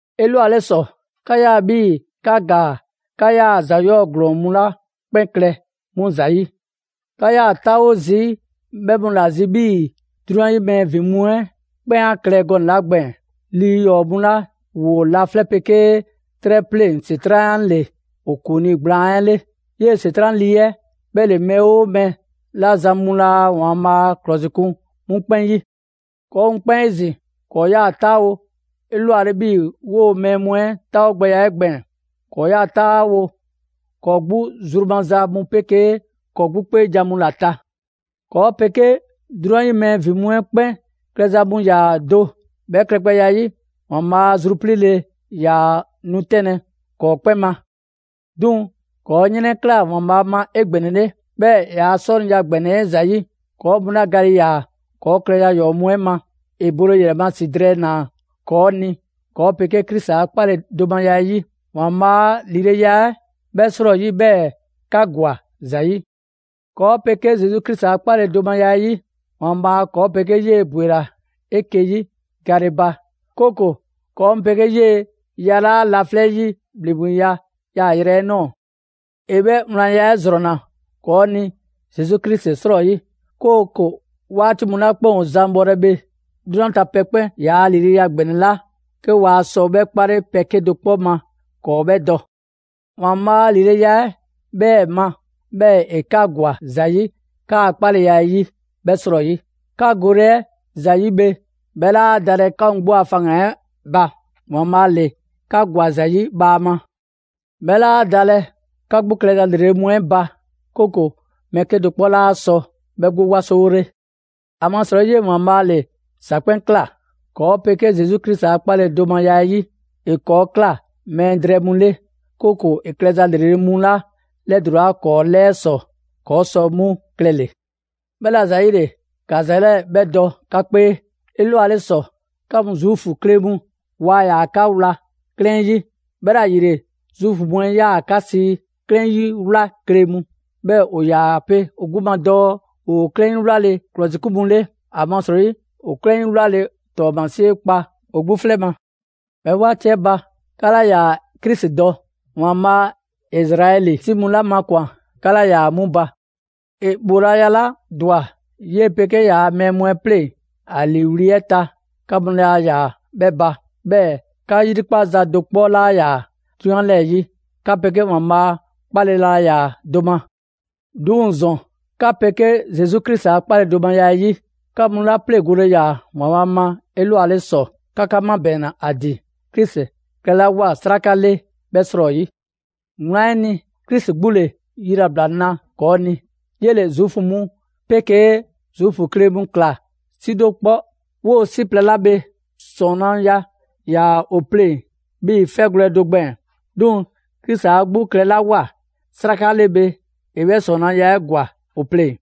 'Elwale ‑sɔ, 'ka 'yaa‑ 'bhii‑ 'ka ‑gaa 'ka 'yaa‑ ‑za 'yɔɔ‑ ‑glɔɔn mu 'la 'kpɛn klɛ 'mu ‑zayi'. 'Ka 'yaa‑ 'taawo zii' 'bhɛ mu ‑la zi 'bhii‑ 'drunyan 'yi mɛɛ ‑vin mu 'ɛ 'kpɛn 'a klɛ gɔnɛ‑ 'la gbɛɛn‑. Lii ‑yɔɔ' mu 'la ‑woo laflɛ' 'pegee 'trɛ 'pleŋ ‑Setran' ‑le ‑o ‑kuŋlii gblaan 'ɛ 'le. 'Yee‑ ‑Setran' lii 'ɛ 'bhɛ ‑le mɛɛ 'oo mɛɛ 'la zan mu laa ‑Waanbhaa' ‑klɔsikun 'mu 'kpɛn 'yi. ‑Kɔɔ' mu 'kpɛn 'ezin‑, ‑kɔɔ' 'yaa‑ 'taawo‑ 'elwale 'bhii‑ 'woo‑ mɛɛ mu 'ɛ 'taawogbɛya 'ɛ gbɛɛn‑. ‑Kɔɔ' 'yaa‑ 'taawo‑ ‑kɔɔ' 'gbu zru maza mu 'pegee ‑kɔɔ' 'gbu 'kpeejan‑ mu ‑la ta. ‑Kɔɔ' 'pegee 'drunyan 'yi mɛɛ ‑vin mu 'ɛ 'kpɛn klɛza mu ‑yaa do. 'Bhɛ klɛgbɛya 'ɛ 'yi, ‑Waanbhaa' a zrupliile 'ɛ 'yaa‑ nu 'tɛnlɛ‑ ‑kɔɔ' 'kpɛn ma. 'Duŋ‑ ‑kɔɔ' 'yrɛnkla ‑Waanbhaa' ma 'egbɛnɛle, 'bhɛɛ‑ ‑yaa' 'sɔniya ‑gbɛnɛ 'ɛ ‑zayi', ‑kɔɔ' mu 'la gale ‑yaa ‑kɔɔ' klɛza ‑yɔɔ' mu 'ɛ ma, ‑e bole ‑yrɛ ma ‑si drɛɛ ꞊naa ‑kɔɔ' ni ‑kɔɔ' 'pegee Krisi a 'kpaledomaya 'ɛ 'yi. ‑Waanbhaa' a ‑lileya 'ɛ 'bhɛɛ‑ 'srɔyi 'bhɛɛ‑ 'ka ‑gwa ‑za 'yi. ‑Kɔɔ' 'pegee Zesu Krisi a 'kpaledomaya 'ɛ 'yi, ‑Waanbhaa' ‑kɔɔ' 'pegee 'yee‑ ‑bwela 'eke‑ 'yi gale ba; 'kooko‑ ‑kɔɔ' mu 'pegee 'yee‑ yalaa' laflɛ' 'yi ‑bhleŋgbeya yaayrɛ ꞊nɔɔ. ‑E 'bhɛ wlanya 'ɛ ‑zrɔnna ‑kɔɔ' ni Zesu Krisi 'srɔyi, 'kooko‑ 'waati mu 'la 'kpɛn ‑o zan bhɔlɛ bhe, 'drunyan ta pɛ 'kpɛn ‑yaa' ‑lileya ‑gbɛnɛ 'la 'ke waa sɔ 'bhɛ 'kpale pɛ 'kedo‑ 'kpɔ ma ‑kɔɔ' 'bhɛ dɔ. ‑Waanbhaa' a ‑lileya 'ɛ 'bhɛɛ‑ ma, 'bhɛɛ‑ ‑e 'ka ‑gwa ‑za 'yi 'kaa‑ 'kpaleya ‑a ‑yi 'bhɛ 'srɔyi. 'Ka gole 'ɛ ‑za 'yi bhe, 'bhɛ 'laa dalɛ 'ka mu 'gbu a faŋgan‑ 'ɛ ba, ‑Waanbhaa' ‑le 'ka ‑gwa ‑za 'yi bhaama; 'bhɛ 'laa dalɛ 'ka 'gbu klɛza ‑lrele' mu 'ɛ ba, 'kooko‑ mɛɛ 'kedo‑ 'kpɔ 'laa sɔ 'bhɛ 'gbu 'wasowole. ‑Amasrɔyi 'yee‑ ‑Waanbhaa' ‑le ‑za 'kpɛn ꞊kla. ‑Kɔɔ' 'pegee Zesu Krisi a kpaledomaya 'ɛ 'yi, ‑e 'kɔɔ‑ ꞊kla mɛɛ drɛɛ mu 'le, 'kooko‑ ‑e klɛza ‑lrele' mu 'la 'lɛdulaa ‑kɔɔ' 'lɛɛ ‑sɔ, ‑kɔɔ' sɔ 'mu klɛle‑. 'Bhɛla‑ ‑zayile, ‑ka ‑za 'lɛɛ‑ 'bhɛ dɔ 'ka 'kpee: 'Elwale ‑sɔ, 'ka mu Zuufu kle mu, waa ‑yaa 'ka wla 'klɛɛn 'yi. 'Bhɛla‑ ‑yile Zuufu mu 'ɛ 'yaa‑ 'ka sii 'klɛɛn 'yi 'wla kle mu; 'bhɛɛ‑ ‑o ‑yaa pe ‑o 'gbu ma dɔɔ ‑woo 'klɛɛn 'yi 'wlale‑ ‑klɔsikun mu 'le, ‑amasrɔyi ‑o 'klɛɛn 'yi 'wlale ‑tɔɔmasie kpa ‑o 'gbu 'flɛ ma. 'Bhɛ 'waati 'ɛ ba, 'ka 'laa ‑yaa Krisi dɔ, ‑Waanbhaa' Izraɛli 'si mu 'la makwan‑, 'ka 'laa ‑yaa 'mu ba; ‑e ‑bhoolaya 'la ‑dwa 'yee‑ 'pegee ‑yaa mɛɛ mu 'ɛ 'pleŋ ‑a ‑liiwli' 'ɛ ta, 'ka mu laa ‑yaa 'bhɛ ba; 'bhɛɛ‑ 'ka 'yrikpaza do 'kpɔ 'laa ‑yaa 'drunyan 'lɛɛ‑ 'yi. 'Ka 'pegee ‑Waanbhaa' 'kpale‑ laa ‑yaa do ma. 'Duŋ‑ ‑zɔn, 'ka 'pegee Krisi Zesu a 'kpaledomaya 'ɛ 'yi, 'ka 'mu 'la 'pleŋgole ‑yaa ‑Waanbhaa' ma 'elwale ‑sɔ, 'ka 'ka 'mabɛɛnna ‑a ‑din Krisi klɛlawoa 'sraka 'le 'bhɛ 'srɔyi. Wlan 'ɛ ni, Krisi 'gbu ‑le yilabla 'na ‑kɔɔ' ni, 'yele‑ Zuufu mu 'pegee Zuufu kle mu ‑kla 'si do 'kpɔ. 'Woo‑ 'si plɛ 'la bhe, ‑sɔɔnaya ‑yaa ‑o pleŋ‑ 'bhii‑ 'fɛgwlɛ‑ do gbɛɛn‑. 'Duŋ‑ Krisi 'a 'gbu klɛlawoa 'sraka 'le bhe, ‑e 'bhɛ ‑sɔɔnaya 'ɛ ‑gwa ‑o pleŋ‑.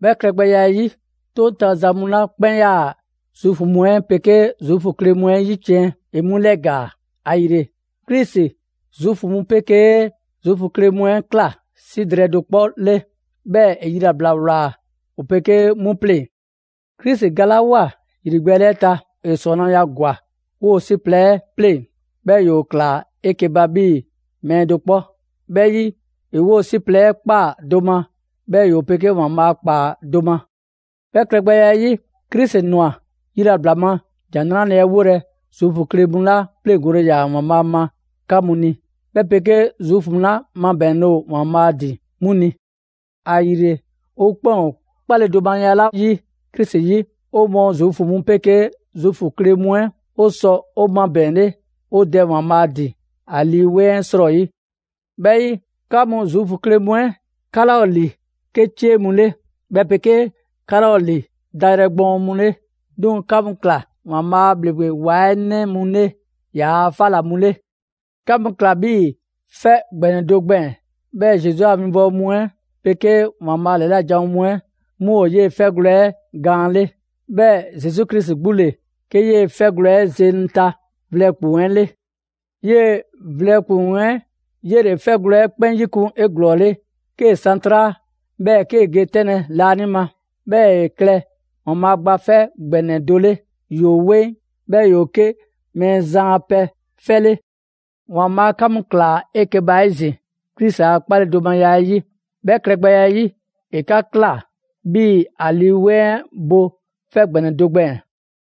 'Bhɛ klɛgbɛya 'ɛ 'yi, 'toŋ ta za mu 'la 'kpɛn 'yaa‑ Zuufu mu 'ɛ 'pegee Zuufu kle mu 'ɛ 'yiciɛn, ‑e 'mu 'lɛgaa‑. ‑Ayile, Krisi Zuufu mu 'pegee Zuufu kle mu 'ɛ ꞊kla 'si drɛɛ do 'kpɔ 'le, 'bhɛɛ‑ ‑e yilabla ꞊wlaa ‑o 'pegee 'mu pleŋ‑. Krisi galawoa ‑yrigbɛɛle 'ɛ ta, ‑e ‑sɔɔnaya ‑gwa 'woo‑ 'si plɛ 'ɛ 'pleŋ‑; 'bhɛɛ‑ ‑yoo ꞊klaa 'eke‑ ba 'bhii‑ mɛɛ do 'kpɔ. 'Bhɛ 'yi, ‑e 'woo‑ 'si plɛ 'ɛ ꞊kpaa do ma, 'bhɛ ‑yoo 'pegee ‑Waanbhaa' ‑kpaa do ma. 'Bhɛ klɛgbɛya 'ɛ 'yi, Krisi ꞊nwa yilabla ma ‑Jan 'Nrale‑ 'ɛ 'wolɛ‑ Zuufu kle mu 'la 'pleŋgole ‑yaa ‑Waanbhaa' ma 'ka mu ni, 'bhɛ 'pegee Zuufu mu 'la 'mabɛɛnle ‑o ‑Waanbhaa' ‑din 'mu ni. ‑Ayile, 'o 'kpɛn ‑o 'kpaledomaya 'la 'yi Krisi 'yi, 'o mɔɔ Zuufu mu 'pegee Zuufu kle mu 'ɛ, 'o sɔ 'o 'mabɛɛnle 'o Dɛ ‑Waanbhaa' ‑din ‑a Lii 'Weŋ 'ɛ 'srɔyi. 'Bhɛ 'yi, 'ka mu Zuufu kle mu 'ɛ, 'ka 'laa ‑o ‑li 'ke 'cie mu 'le, 'bhɛ 'pegee 'ka 'laa ‑o ‑li dayrɛ gbɔɔn mu 'le. 'Duŋ‑ 'ka mu ꞊kla ‑Waanbhaa' a ‑bhleŋgbe ‑wa 'ɛ 'nɛ mu 'le ‑yaa' 'fa ‑la mu 'le. 'Ka mu ꞊kla 'bhii‑ 'fɛ ‑gbɛnɛ do gbɛɛn‑; 'bhɛɛ‑ Zesu a winbɔwo mu 'ɛ 'pegee ‑Waanbhaa' ‑lɛla' janwo mu 'ɛ 'mu ‑o 'yee‑ 'fɛgwlɛ‑ 'ɛ gaan 'le. 'Bhɛɛ‑ Zesu Krisi 'gbu ‑le 'ke 'yee‑ 'fɛgwlɛ‑ 'ɛ zeŋ ta vlɛ ‑kpuŋ 'ɛ 'le. 'Yee‑ vlɛ ‑kpuŋ 'ɛ 'yele‑ 'fɛgwlɛ‑ 'ɛ 'kpɛn 'yikun 'eglɔɔle 'kee‑ san 'traa, 'bhɛɛ‑ 'kee ge 'tɛnlɛ‑ laanima. 'Bhɛɛ‑ ‑e klɛ ‑Waanbhaa' Gba 'Fɛ ‑Gbɛnɛ do 'le, ‑yoo 'weŋ, 'bhɛɛ‑ ‑yoo 'ke Mɛɛzan a pɛ 'fɛ 'le. ‑Waanbhaa' 'ka mu ꞊klaa 'eke‑ ba 'ezin‑ Krisi a 'kpaledomaya 'ɛ 'yi. 'Bhɛ klɛgbɛya 'ɛ 'yi, ‑e 'ka ꞊kla 'bhii‑ ‑a Lii 'Weŋ 'ɛ bo 'fɛ ‑gbɛnɛ do gbɛɛn‑.